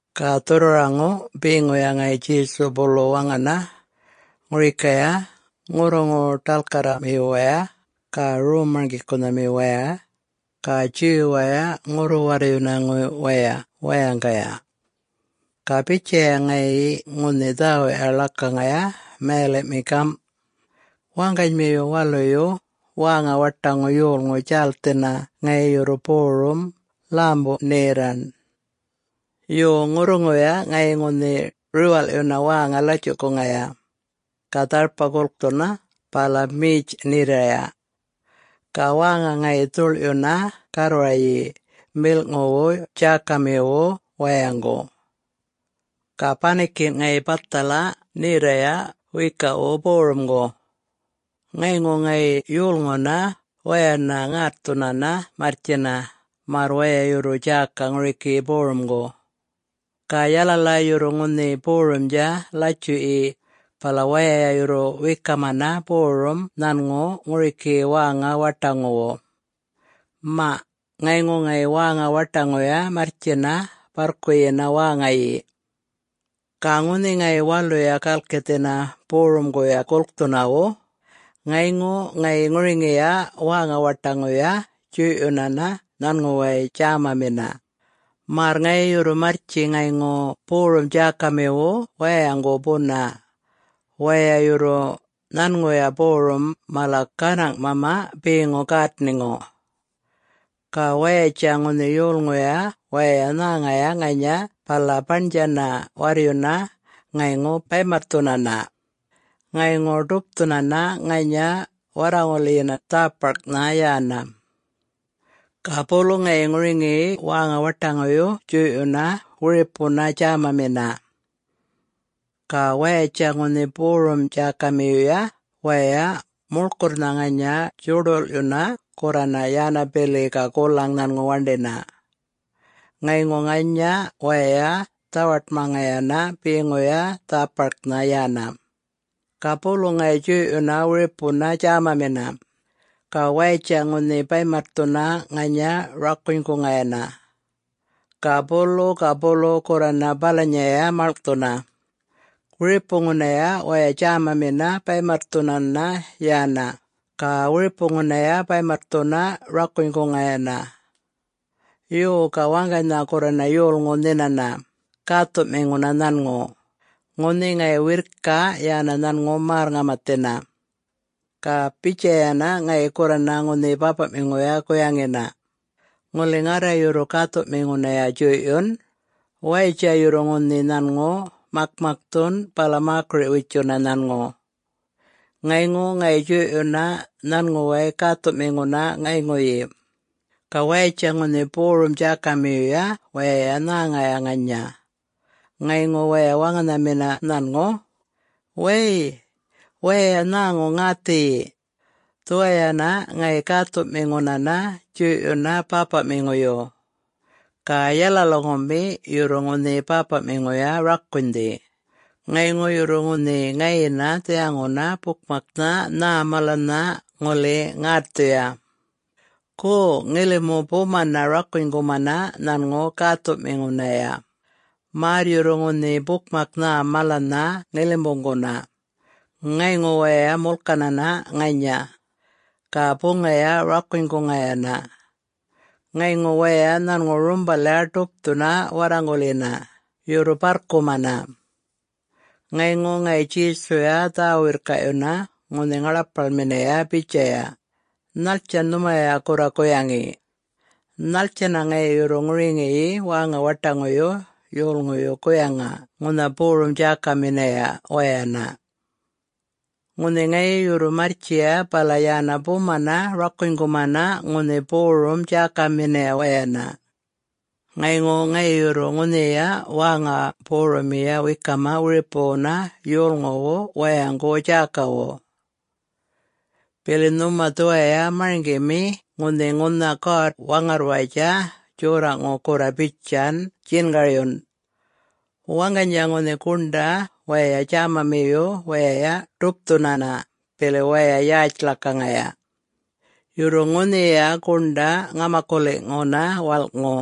Ga dhurrwaraŋu beŋuya ŋayi Djesu bulu waŋana ŋurikaya ŋurruŋu-ḏalkarramiwaya ga rom-marŋgikunhamiwaya ga Jew-waya ŋurru-warryunayŋuwaya wayaŋgaya. Ga bitjaya ŋayi ŋunhi dhäwuꞌya ḻakaŋaya mayaliꞌmi gamꞌ, “Waŋganymiyu waluyu wäŋa-waṯaŋu yolŋu djälthina ŋayi yurru borum, ḻämu-nherraṉ. Yo, ŋurruŋuya ŋayi ŋunhi riwalꞌyuna wäŋa latjuꞌkuŋaya, ga dharpa gulkthuna, bala metj-nherraya. Ga wäŋa ŋayi dhuḻꞌyuna garrwaryi milꞌŋuwu djäkamiwu wayaŋgu. Ga banikinꞌ ŋayi bathala nherraya wiyikaꞌwu borumgu. Ŋayŋu ŋayi yolŋunaya wayana ŋätthunana marrtjina märr waya yurru djäka ŋuriki borumgu. Ga yalala yurru ŋunhi borumdja latjuꞌyi bala waya yurru wekamana borum nhanŋu ŋuriki wäŋa-waṯaŋuwu. Maꞌ, ŋayŋu ŋayi wäŋa-waṯaŋuya marrtjina barrkuyina wäŋayi. Ga ŋunhi ŋayi waluya galkithina borumguya gulkthunawu, ŋayŋu ŋayi ŋuriŋiya wäŋa-waṯaŋuyuya djuyꞌyunana nhanŋuway djämamina, märr ŋayi yurru marrtji ŋayŋu borum-djäkamiwu wayaŋgu buna waya yurru nhanŋuya borum mala ganaŋꞌmama beŋu gätniŋu. Ga wayatja ŋunhi yolŋuya wayay nhäŋaya ŋanya bala baṉdjana warryuna ŋayŋu baymatthunana, ŋayŋu ḏupthuna ŋanya warraŋulyina dhäparknha yana. Ga bulu ŋayi ŋuriŋi wäŋa-waṯaŋuyu djuyꞌyuna wiripuna djämamina. Ga wayatja ŋunhi borum-djäkamiyuya wayay muḻkurrnha ŋanya djuḏulꞌyuna gurrana yana bili ga gulaŋ nhanŋu waṉdina. Ŋayŋu ŋanya waya dhawaṯmaŋayana beŋuya dhäparknha yana. Ga bulu ŋayi djuyꞌyuna wiripuna djämamina. Ga wayatja ŋunhi baymatthuna ŋanya rakunyguŋayana. Ga bulu ga bulu gurrana balanyaya maḻŋꞌthuna. Wiripunaya waya djämamina baymatthunana yana, ga wiripunaya baymatthuna rakunyguŋayana. Yo, ga waŋganynha gurrana yolŋu nhinana, gäthuꞌmiŋuna nhanŋu, ŋunhi ŋayi wirrki yana nhanŋu märr-ŋamathina. Ga bitjayana ŋayi gurrana ŋunhi bäpaꞌmiŋuya guyaŋina, ‘Ŋuli ŋarra yurru gäthuꞌmiŋunaya djuyꞌyun, wayatja yurru ŋunhi nhanŋu makmakthun bala mäkiriꞌ-witjuna nhanŋu.’ Ŋayŋu ŋayi djuyꞌyuna nhanŋuway gäthuꞌmiŋuna ŋayŋuyi. Ga wayatja ŋunhi borum-djäkamiyuya wayay nhäŋaya ŋanya, ŋayŋu waya waŋanhamina nhanŋu, ‘Way, waya nhäŋu ŋäthiyi! Dhuwayana ŋayi gäthuꞌmiŋunana djuyꞌyuna bäpaꞌmiŋuyu. Ga yalalami yurru ŋunhi bäpaꞌmiŋuya rakunydhi, ŋayŋu yurru ŋunhi ŋayina dhiyaŋuna bukmaknha nhä malanynha ŋuli ŋätthuya. Go, ŋilimu bumana rakunygumana nhanŋu gäthuꞌmiŋunaya, märr yurru ŋunhi bukmak nhä malanynha ŋilimuŋguna.’ Ŋayŋu waya mulkanana ŋanya, ga buŋaya rakunyguŋayana. Ŋayŋu waya nhanŋu rumbalya ḏupthuna warraŋulyina, yurru barrkumana.” Ŋayŋu ŋayi Djesuya dhä-wirrkaꞌyuna ŋunhi ŋaḻapaḻminaya bitjayana, “Nhattjan nhumaya gurra guyaŋi? Nhattjana ŋayi yurru ŋuriŋi wäŋa-waṯaŋuyu yolŋuyu guyaŋa ŋunha borum-djäkaminaya wayana? Ŋunhi ŋayi yurru marrtjiya bala yana bumana rakunygumana ŋunhi borum-djäkaminaya wayana. Ŋayŋu ŋayi yurru ŋunhiya wäŋa borummiya wekama wiripuwuna yolŋuwu wayaŋgu djäkawu. Bili nhuma dhuwaya marŋgimi ŋunhi ŋunha God-Waŋarrwayatja Djorraꞌŋu gurra bitjan djingaryun, ‘Waŋganydja ŋunhi guṉḏa waya djämamiyu wayay ḏupthunana bili waya yätj ḻakaŋaya. Yurru ŋunhiya guṉḏa ŋamakuliꞌŋuna walꞌŋu,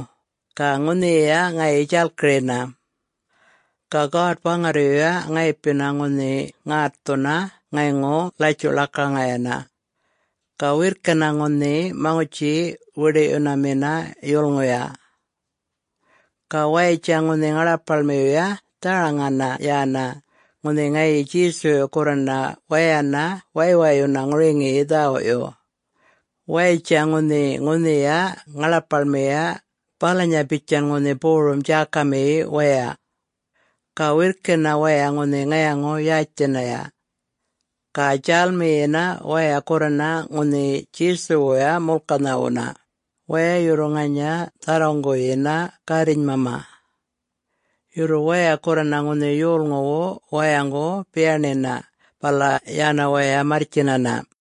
ga ŋunhiya ŋayi djalkirina. Ga God-Waŋarryuya ŋayipina ŋunhi ŋätthuna ŋayŋu latjuꞌ-ḻakaŋayana. Ga wirrkina ŋunhi maŋutji-wiḏiꞌyunamina yulŋuya!’” Ga wayatja ŋunhi ŋaḻapaḻmiyuya dharaŋayana yana ŋunhi ŋayi Djesuyu gurrana wayana waywayuna ŋuriŋi dhäwuꞌyu. Wayatja ŋunhi ŋunhiya ŋaḻapaḻmiya balanya bitjan ŋunhi borum-djäkami waya. Ga wirrkina waya ŋunhi ŋayaŋu-yätjthinaya. Ga djälmiyina waya gurrana ŋunhi Djesuwuya mulkanhawuna, waya yurru ŋanya dharruŋguyina gärrinymama. Yurru waya gurrana ŋunhi yolŋuwu wayaŋgu biyaṉiyina, bala yana waya marrtjinana.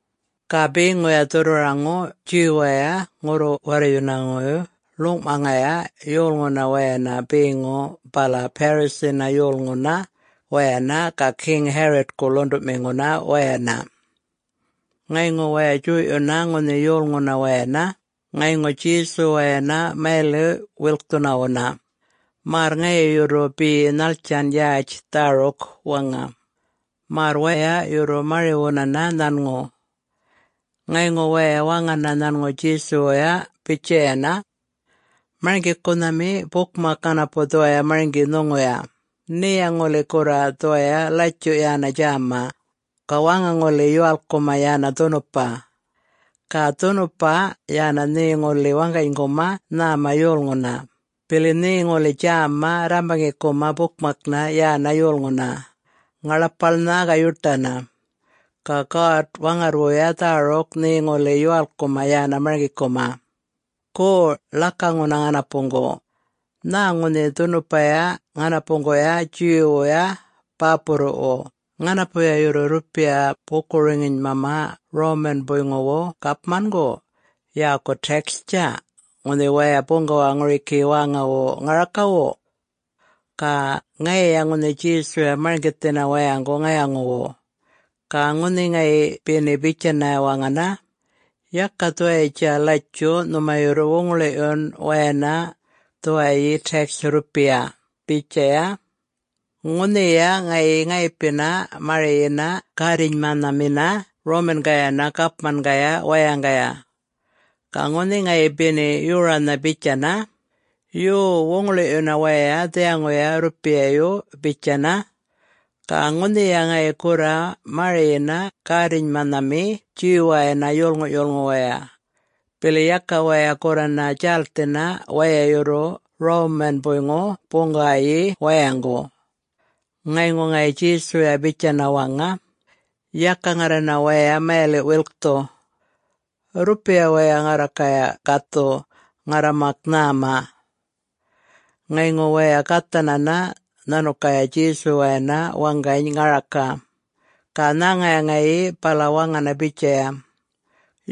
Ga beŋuya dhurrwaraŋu Jew-waya ŋurru-warryunayŋuyu ḻuŋꞌmaŋaya yolŋuna wayana beŋu bala Pharisee-na yolŋuna wayana ga King Herod-ku ḻuṉḏuꞌmiŋuna wayana. Ŋayŋu waya djuyꞌyuna ŋunhi yolŋuna wayana ŋayŋu Djesuwayana mayaliꞌ-wilkthunawuna, märr ŋayi yurru be nhattjan yätj dhäruk waŋa, märr waya yurru mariwunana nhanŋu. Ŋayŋu waya waŋana nhanŋu Djesuwuya bitjayana, “Marŋgikunhami, bukmak ŋanapu dhuwaya marŋgi nhuŋuya, nheya ŋuli gurra dhuwaya latjuꞌ yana djäma, ga waŋa ŋuli yuwalkkuma yana dhunupa. Ga dhunupa yana nhe ŋuli waŋganyguma nhäma yolŋuna, bili nhe ŋuli djäma rrambaŋikuma bukmakna yana yolŋuna, ŋaḻapaḻna ga yuṯana. Ga God-Waŋarrrwuya dhäruk nhe ŋuli yuwalkkuma yana marŋgikuma. Go, ḻakaŋuna ŋanapuŋgu, nhä ŋunhi dhunupaya ŋanapuŋguya Jew-wuya bäpurruꞌwu ŋanapu yurru rrupiya buku-roŋinymama Roman-buyŋuwu gapmangu yäku tax-tja, ŋunhi waya buŋgawa ŋuriki wäŋawu ŋarakawu?” Ga ŋayiya ŋunhi Djesuya marŋgithina wayaŋgu ŋayaŋuwu. Ga ŋunhi ŋayi beni bitjana waŋanha, ‘Yaka dhuwayitja latjuꞌ nhuma yurru wuŋiḻiyun wayana dhuwayi tax rrupiya,’ bitjaya, ŋunhiya ŋayi ŋayipini mariyina gärrinymanhamina Roman-gayana gapmangaya wayaŋgaya. Ga ŋunhi ŋayi beni yoranha bitjana, ‘Yuw, wuŋiḻiyuna waya dhiyaŋuya rrupiyayu,’ bitjana, ga ŋunhiya ŋayi gurra mariyina gärrinymanhami Jew-wayana yolŋuꞌ-yulŋu waya, bili yaka waya gurrana djälthina waya yurru Roman-buyŋu buŋgawayi wayaŋgu. Ŋayŋu ŋayi Djesuya bitjana waŋa, “Yaka ŋarrana waya mayaliꞌ-wilkthu. Rrupiya waya ŋarrakaya gathu ŋarra mak nhäma.” Ŋayŋu waya gathana nhanukaya Djesuwayana waŋgany ŋaraka. Ga nhäŋaya ŋayi, bala waŋana bitjaya,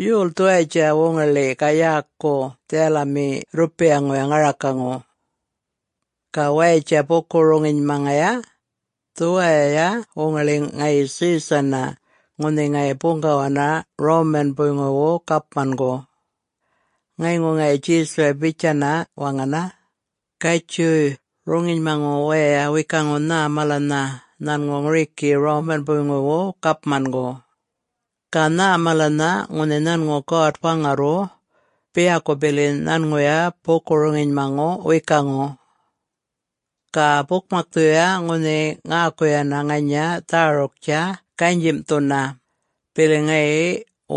“Yol dhuwayatja wuŋiḻi ga yäku dhiyalamiya rrupiyaŋu ŋarakaŋu?” Ga wayatja buku-roŋinymaŋaya, “Dhuwayiya wuŋiḻi ŋayi Caesar-na ŋunhi ŋayi buŋgawana Roman-buyŋuwu gapmangu!” Ŋayŋu ŋayi Djesuya bitjayana waŋana, “Gatjuy, roŋinymaŋu waya wekuŋu nhä malanynha nhanŋu ŋuriki Roman-buyŋuwu gapmangu. Ga nhä malanynha ŋunhi nhanŋu God-Waŋarrwu, biyaku bili nhanŋuya buku-roŋinymaŋu wekuŋu.” Ga bukmakthuya ŋunhi ŋäkuyana ŋanya dhäruktja ganyimꞌthuna, bili ŋayi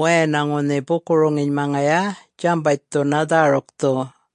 wayana ŋunhi buku-roŋinymaŋaya djambatjthuna dhärukthu.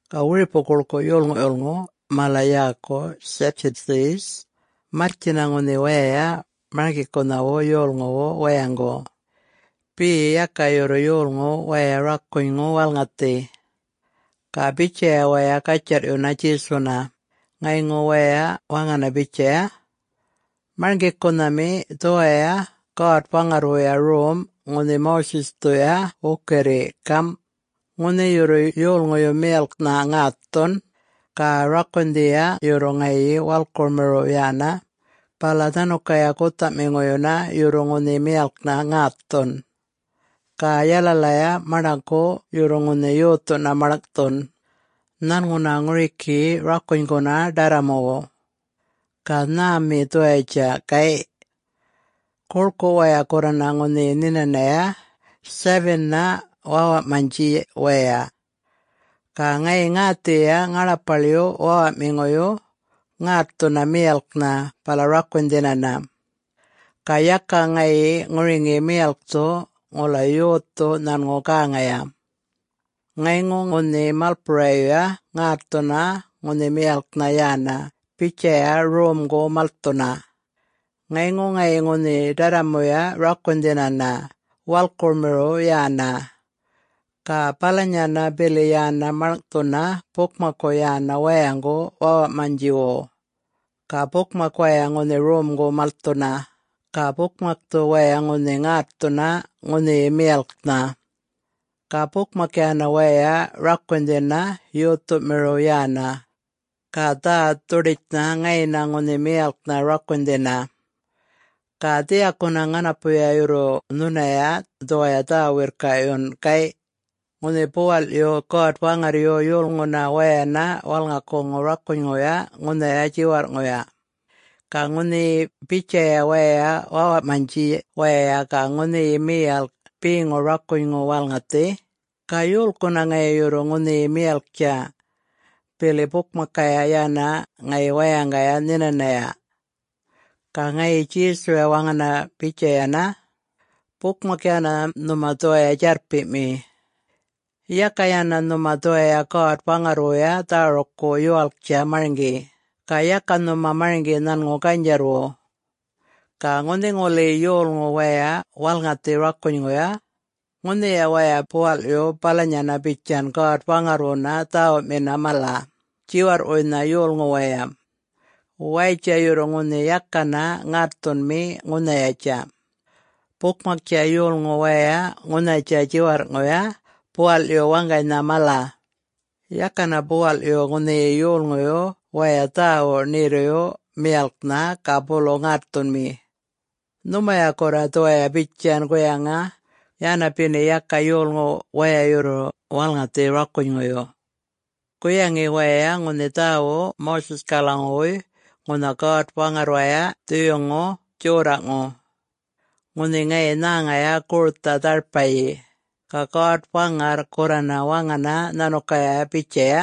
Ga wiripu guḻkuꞌ yolŋuꞌ-yulŋu mala yäku Sadducees marrtjina ŋunhi waya marŋgikunhawu yolŋuwu wayaŋgu, be yaka yurru yolŋu waya rakunyŋu walŋathi. Ga bitjaya waya gatjarrꞌyuna Djesuna, ŋayŋu waya waŋana bitjaya, “Marŋgikunhami, dhuwaya God-Waŋarrwuya rom ŋunhi Moses-thuya wukirri, gamꞌ: Ŋunhi yurru yolŋuyu miyalknha ŋätthun, ga rakunydhiya yurru ŋayi walkurmiriw yana, bala nhanukaya guthaꞌmiŋuyuna yurru ŋunhi miyalknha ŋätthun. Ga yalalaya maṉḏaku yurru ŋunhi yothuna maḻŋꞌthun, nhanŋuna ŋuriki rakunyguna ḏarramuwu. Ga nhämi dhuwayatja, gayꞌ? Guḻkuꞌ waya gurrana ŋunhi nhinanaya, seven-na wäwaꞌmanydji waya. Ga ŋayi ŋäthiyiya ŋaḻapaḻyu wäwaꞌmiŋuyu ŋätthuna miyalknha bala rakunydhinana, ga yaka ŋayi ŋuriŋi miyalkthu ŋula yothu nhanŋu gäŋaya. Ŋayŋu ŋunhi malpurayuya ŋätthuna ŋunhi miyalknha yana bitjaya romgu malthuna. Ŋayŋu ŋayi ŋunhi ḏarramuya rakunydhinana, walkurmiriw yana. Ga balanyana bili yana maḻŋꞌthuna bukmakku yana wayaŋgu wäwaꞌmanydjiwu. Ga bukmak waya ŋunhi romguya malthuna, ga bukmakthu waya ŋunhi ŋätthuna ŋunhiyi miyalknha. Ga bukmak yana waya rakunydhina yothumiriw yana. Ga dhä-dhuḏitjnha ŋayina ŋunhi miyalknha rakunydhina. Ga dhiyakuna ŋanapu yurru nhunaya dhuwaya dhä-wirrkaꞌyun, gayꞌ: Ŋunhi buwaḻꞌyu God-Waŋarryu yolŋunaya wayana walŋakuŋu rakunyŋuya ŋunhaya djiwarrꞌŋuya, ga ŋunhi bitjaya waya wäwaꞌmanydji waya ga ŋunhiyi miyalk beŋu rakunyŋuyu walŋathi, ga yolkuna ŋayi yurru ŋunhi miyalktja, bili bukmakkaya yana ŋayi wayaŋgaya nhinanaya?” Ga ŋayi Djesuya waŋana bitjayana, “Bukmak yana nhuma dhuwaya djarrpiꞌmi. Yaka yana nhuma dhuwaya God-Waŋarrwuya dhärukku yuwalktja marŋgi, ga yaka nhuma marŋgi nhanŋu ganydjarrwu. Ga ŋunhi ŋuli yolŋu waya walŋathi rakunyŋuyu, ŋunhiya waya buwaḻꞌyu balanyana bitjan God-Waŋarrwuna dhäwuꞌmina mala, djiwarrꞌwuynha yolŋu waya. Wayatja yurru ŋunhi yakana ŋätthunmi ŋunhayatja. Bukmaktja yolŋu waya ŋunhayatja djiwarrꞌŋuya buwaḻꞌyu waŋganynha mala. Yakana buwaḻꞌyu ŋunhi yolŋuyu wayay dhawuꞌ nherruyu miyalknha ga bulu ŋätthunmi. Nhumaya gurra dhuwaya bitjan guyaŋa yana beni yaka yolŋu waya yurru walŋathi rakunyŋuyu. Guyaŋi waya ŋunhi dhäwuꞌ Moses-kalaŋuwuy ŋunha God-Waŋarrwaya dhuyuŋu djorraꞌŋu: ŋunhi ŋayi nhäŋaya gurtha dharpayi, ga God-Waŋarr gurrana waŋana nhanukaya bitjaya,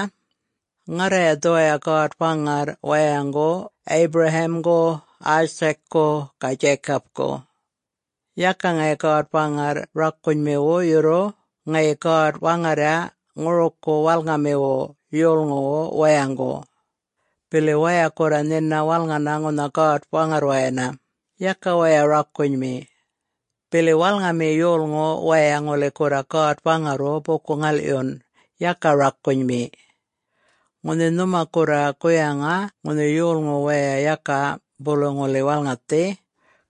‘Ŋarraya dhuwaya God-Waŋarr wayaŋgu Abraham-gu, Isaac-ku ga Jacob-ku.’ Yaka ŋayi God-Waŋarr rakunymiwu yurru ŋayi God-Waŋarrya ŋuruku walŋamiwu yolŋuwu wayaŋgu. Bili waya gurra nhina walŋana ŋunha God-Waŋarrwayana, yaka waya rakunymi. Bili walŋami yolŋu waya ŋuli gurra God-Waŋarrwu buku-ŋalꞌyun, yaka rakunymi. Ŋunhi nhuma gurra guyana ŋunhi yolŋu waya yaka bulu ŋuli walŋathi,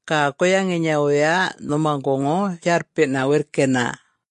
ga guyaŋinyawuyya nhumaŋguŋu djarrpiꞌna wirrkina.”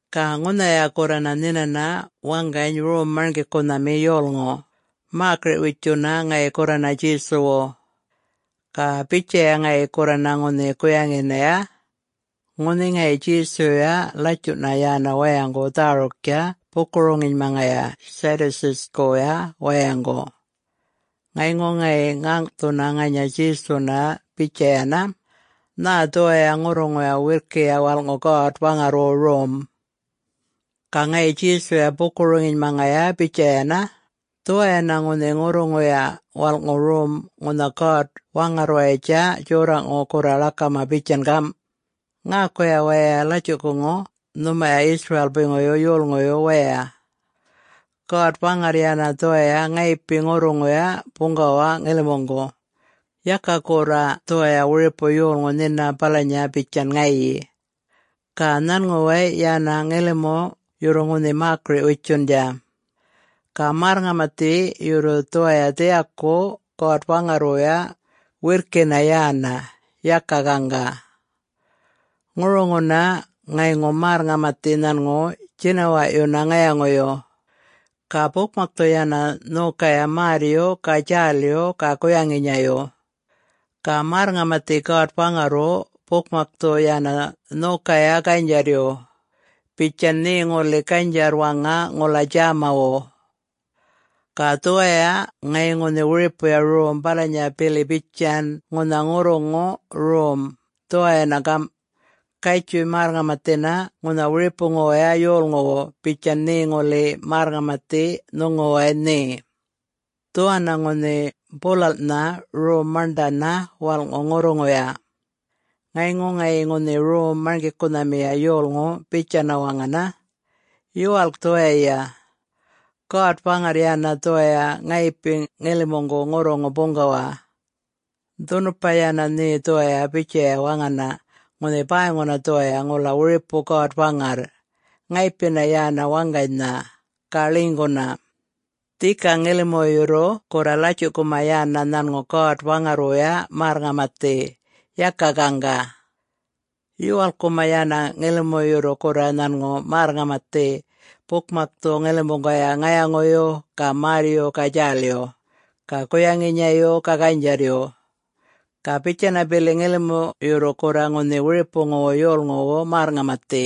Ga ŋunhaya gurrana nhinana waŋgany rom-marŋgikunhami yolŋu, mäkiriꞌ-witjuna ŋayi gurrana Djesuwu. Ga bitjaya ŋayi gurrana ŋunhi guyaŋinaya: ŋunhi ŋayi Djesuyuya latjuꞌna yana wayaŋgu dhäruktja buku-roŋinymaŋaya Sadducees-kuya wayaŋgu. Ŋayŋu ŋayi ŋäŋꞌthuna ŋanya Djesuna bitjayana, “Nhä dhuwaya ŋurruŋuya wirrkiya walꞌŋu God-Waŋarrwu Rom?” Ga ŋayi Djesuya buku-roŋinymaŋaya bitjayana, “Dhuwanna ŋunhi ŋurruŋuya walꞌŋu rom ŋunha God-Waŋarrwayatja djorraꞌŋu gurra ḻakama bitjan gamꞌ, ‘Ŋäkuya waya latjuꞌkuŋu, nhumaya Israel-puyŋuyu yolŋuyu wayay! God-Waŋarr yana dhuwaya ŋayipi ŋurruŋuya buŋgawa ŋilimuŋgu, Yaka gurra dhuwaya wiripu yolŋu nhina balanya bitjan ŋayi. Ga nhanŋuway yana ŋilimu yurru ŋunhi mäkiriꞌ-witjundja! Ga märr-ŋamathi yurru dhuwaya dhiyaku God-Waŋarrwuya wirrki yana, yaka ganga. Ŋuruŋuna ŋayŋu märr-ŋamathi nhanŋu djinawaꞌyuna ŋayaŋuyu, ga bukmakthu yana nhokaya märryu, ga djälyu, ga guyaŋinyayu. Ga märr-ŋamathi God-Waŋarrwu bukmakthu yana nhokaya ganydjarryu, bitjan nhe ŋuli ganydjarr-waŋa ŋula djämawu.’ Ga dhuwaya ŋayi ŋunhi wiripuya rom balanya bili bitjan ŋunha ŋurruŋu rom, dhuwanna gamꞌ: ‘Gatjuy, märr-ŋamathina ŋunha wiripuwuya yolŋuwu bitjan nhe ŋuli märr-ŋamathi nhuŋuway nhe.’ Dhuwanna ŋunhi bulalꞌnha rom maṉḏana walꞌŋu ŋurruŋuya.” Ŋayŋu ŋayi ŋunhi rom-marŋgikunhamiya yolŋu bitjayana waŋana, “Yuwalk dhuwayiya! God-Waŋarr yana dhuwaya ŋayipi ŋilimuŋgu ŋurruŋu buŋgawa. Dhunupa yana nhe dhuwaya bitjaya waŋana ŋunhi ‘Bäyŋuna dhuwaya ŋula wiripu God-Waŋarr,... ŋayipina yana waŋganynha, ga ḻinyguna!’ Dhika ŋilimu yurru gurra latjuꞌkuma yana nhanŋu God-Waŋarrwuya märr-ŋamathi, yaka gaŋga. Yuwalkkuma yana ŋilimu yurru gurra nhanŋu märr-ŋamathi bukmakthu ŋilimuŋgaya ŋayaŋuyu, ga märryu, ga djälyu, ga guyaŋinyayu, ga ganydjarryu. Ga bitjana bili ŋilimu yurru gurra ŋunhi wiripuwu yolŋuwu märr-ŋamathi,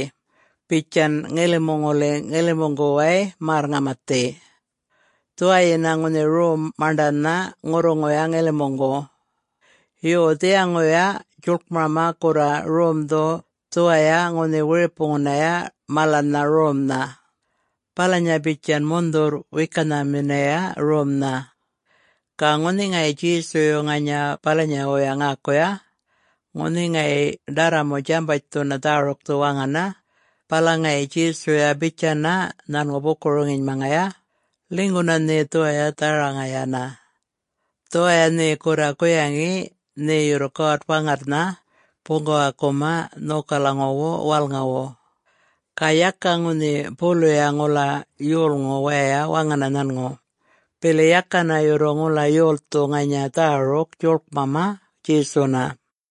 bitjan ŋilimu ŋuli ŋilimuŋguway märr-ŋamathi. Dhuwayina ŋunhi rom maṉḏana ŋurruŋuya ŋilimuŋgu. Yo, dhiyaŋuya djuḻkmama gurra romdhu dhuwaya ŋunhi wiripunaya malana romnha, balanya bitjan mundhurr-wekanaminaya romnha.” Ga ŋunhi ŋayi Djesuyu ŋanya balanyawuya ŋäkuya, ŋunhi ŋayi ḏarramu djambatjthuna dhärukthu waŋana, bala ŋayi Djesuya bitjayana nhanŋu buku-roŋinymaŋaya, “Ḻinyguna nhe dhuwaya dharaŋayana, dhuwaya nhe gurra guyaŋina nhe yurru God-Waŋarrnhana buŋgawakuma nhokalaŋuwu walŋawu.” Ga yaka ŋunhi buluya ŋula yolŋu waya waŋana nhanŋu, bili yakana yurru ŋula yolthu ŋanya dhäruk djuḻkmama Djesuna.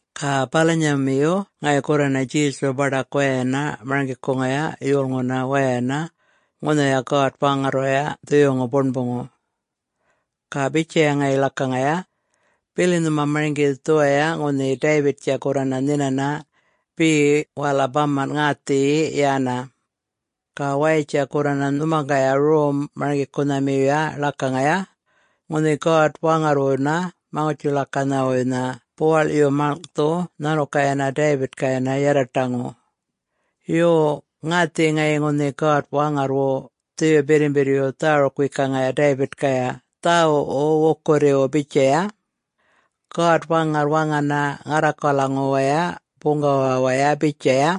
Ga balanyamiyu ŋayi gurrana Djesuyu baḏak wayana marŋgikuŋaya yolŋuna wayana ŋunhaya God-Waŋarrwaya Dhuyuŋu Buṉbuŋu. Ga bitjaya ŋayi ḻakaŋaya, “Bili nhuma marŋgi dhuwaya ŋunhi David-tja gurrana nhinana be wala bamanꞌ ŋäthiyi yana. Ga wayatja gurrana nhumaŋgaya rom-marŋgikunhamiyuya ḻakaŋaya, ŋunhi God-Waŋarrwuna Maŋutji-ḻakanhawuynha buwaḻꞌyu maḻŋꞌthu nhanukayana David-kaya yarraṯaŋu. Yo, ŋäthiyi ŋayi ŋunhi God-Waŋarrwu Dhuyu Birrimbirryu dhäruk-wekaŋaya David-kaya dhäwuꞌwu wukirriwu bitjaya: God-Waŋarr waŋana ŋarrakalaŋuwaya buŋgawawaya bitjaya,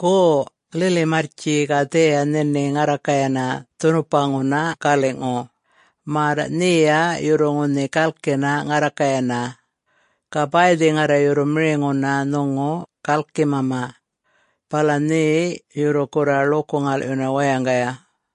‘Go! Lili marrtji, ga dhiya nhini ŋarrakayana dhunupaꞌŋuna galiꞌŋu, märr nheya yurru ŋunhi galkina ŋarrakayana, ga bäythi ŋarra yurru miriŋuna nhuŋu gälkinymama, bala nhe yurru gurra ḻuku-ŋalꞌyuna wayaŋgaya.’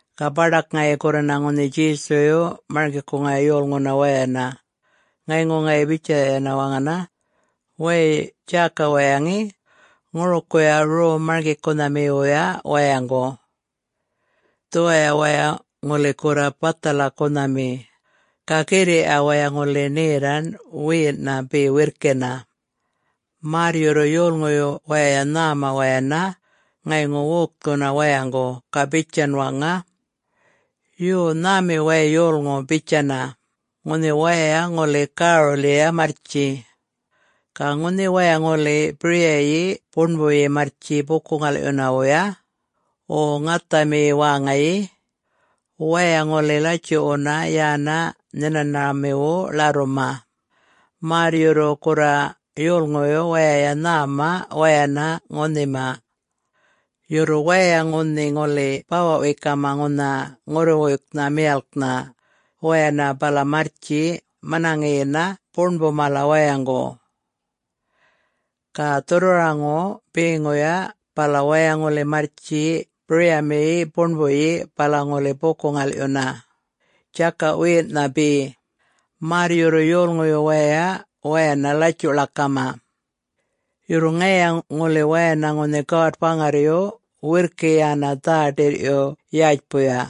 Ga baḏak ŋayi gurrana ŋunhi Djesuyu marŋgikuŋaya yolŋuna wayana, ŋayŋu ŋayi bitjayana waŋana, “Wäy, djäka waya ŋe, ŋurukuya rom marŋgikunhamiwuya wayaŋgu! Dhuwaya waya ŋuli gurra bathalakunhami, ga girriꞌya waya ŋuli nherraṉ wiyinꞌna be wirrkina, märr yurru yolŋuyu wayay nhäma wayana ŋayŋu wokthuna wayaŋgu ga bitjana waŋa, ‘Yo, nhämi way yolŋu,’ bitjana, ŋunhi waya ŋuli gärulyiya marrtji. Ga ŋunhi waya ŋuli biryayi buṉbuyi marrtji buku-ŋalꞌyunawuya, wo ŋathamiyi wäŋayi, waya ŋuli latjuꞌwuna yana nhinanhamiwu ḻarruma, märr yurru gurra yolŋuyu wayay nhäma wayana ŋunhima. Yurru waya ŋunhi ŋuli bawaꞌ-wekama ŋunha ŋurruwuyknha miyalknha wayana bala marrtji manaŋina buṉbu mala wayaŋgu. Ga dhurrwaraŋu beŋuyu bala waya ŋuli marrtji biryamiyina buṉbuyi bala ŋuli buku-ŋalꞌyuna, djakaꞌ-wiyinꞌna be, märr yurru yolŋuyu wayay wayana latjuꞌ-ḻakama. Yurru ŋayiya ŋuli wayana ŋunhi God-Waŋarryuya wirrkina yana dhä-ḏirꞌyu yätjpuya.”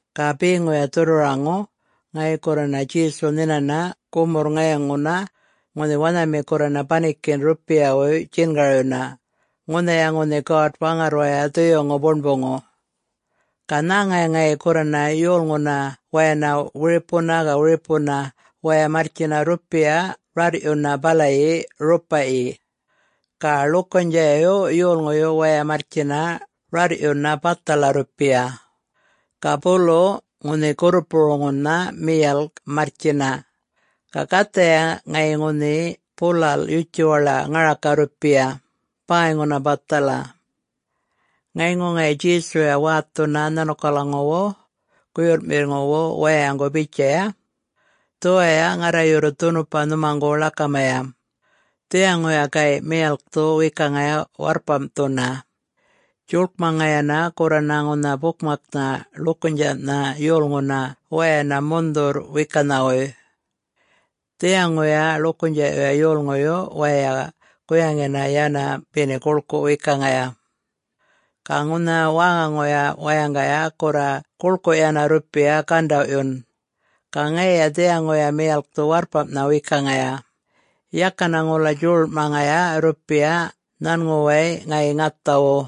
Ga beŋuya dhurrwaraŋu, ŋayi gurrana Djesu nhinana gumurr ŋayŋuna ŋunhi wanhami gurrana banikinꞌ rrupiyawuy djingaryuna ŋunhaya ŋunhi God-Waŋarrwaya Dhuyuŋu Buṉbuŋu. Ga nhäŋaya ŋayi gurrana yolŋuna wayana wiripuna ga wiripuna waya marrtjina rrupiya rarrꞌyuna balayi rupaꞌyi. Ga ḻukunydjaꞌyu yolŋuyu wayay marrtjina rarrꞌyuna bathala rrupiya. Ga bulu ŋunhi gurrupuruŋunha miyalk marrtjina, ga gathaya ŋayi ŋunhi bulalꞌ yutjuwaḻaꞌ ŋaraka rrupiya, bäyŋuna bathala. Ŋayŋu ŋayi Djesuya wäthunana nhanukalaŋuwu guyurrꞌmiŋuwu wayaŋgu bitjaya, “Dhuwaya ŋarra yurru dhunupa nhumaŋgu ḻakamaya: Dhiyaŋuya gayꞌ miyalkthu wekaŋaya warrpamꞌthuna, djuḻkmaŋayana gurrana ŋunha bukmaknha ḻukunydjaꞌna yolŋuna wayana mundhurr-wekanhawuy. Dhiyaŋuya ḻukunydjaꞌyu yolŋuyu wayay guyaŋina yana beni guḻkuꞌ wekaŋaya. Ga ŋunha wäŋaŋu wayaŋgaya gurra guḻkuꞌ yana rrupiya gandawꞌyun. Ga ŋayiya dhiyaŋuya miyalkthu warrpamnha wekaŋaya, yakana ŋula djuḻuḻꞌmaŋaya rrupiya nhanŋuwaya ŋayi ŋathawu.”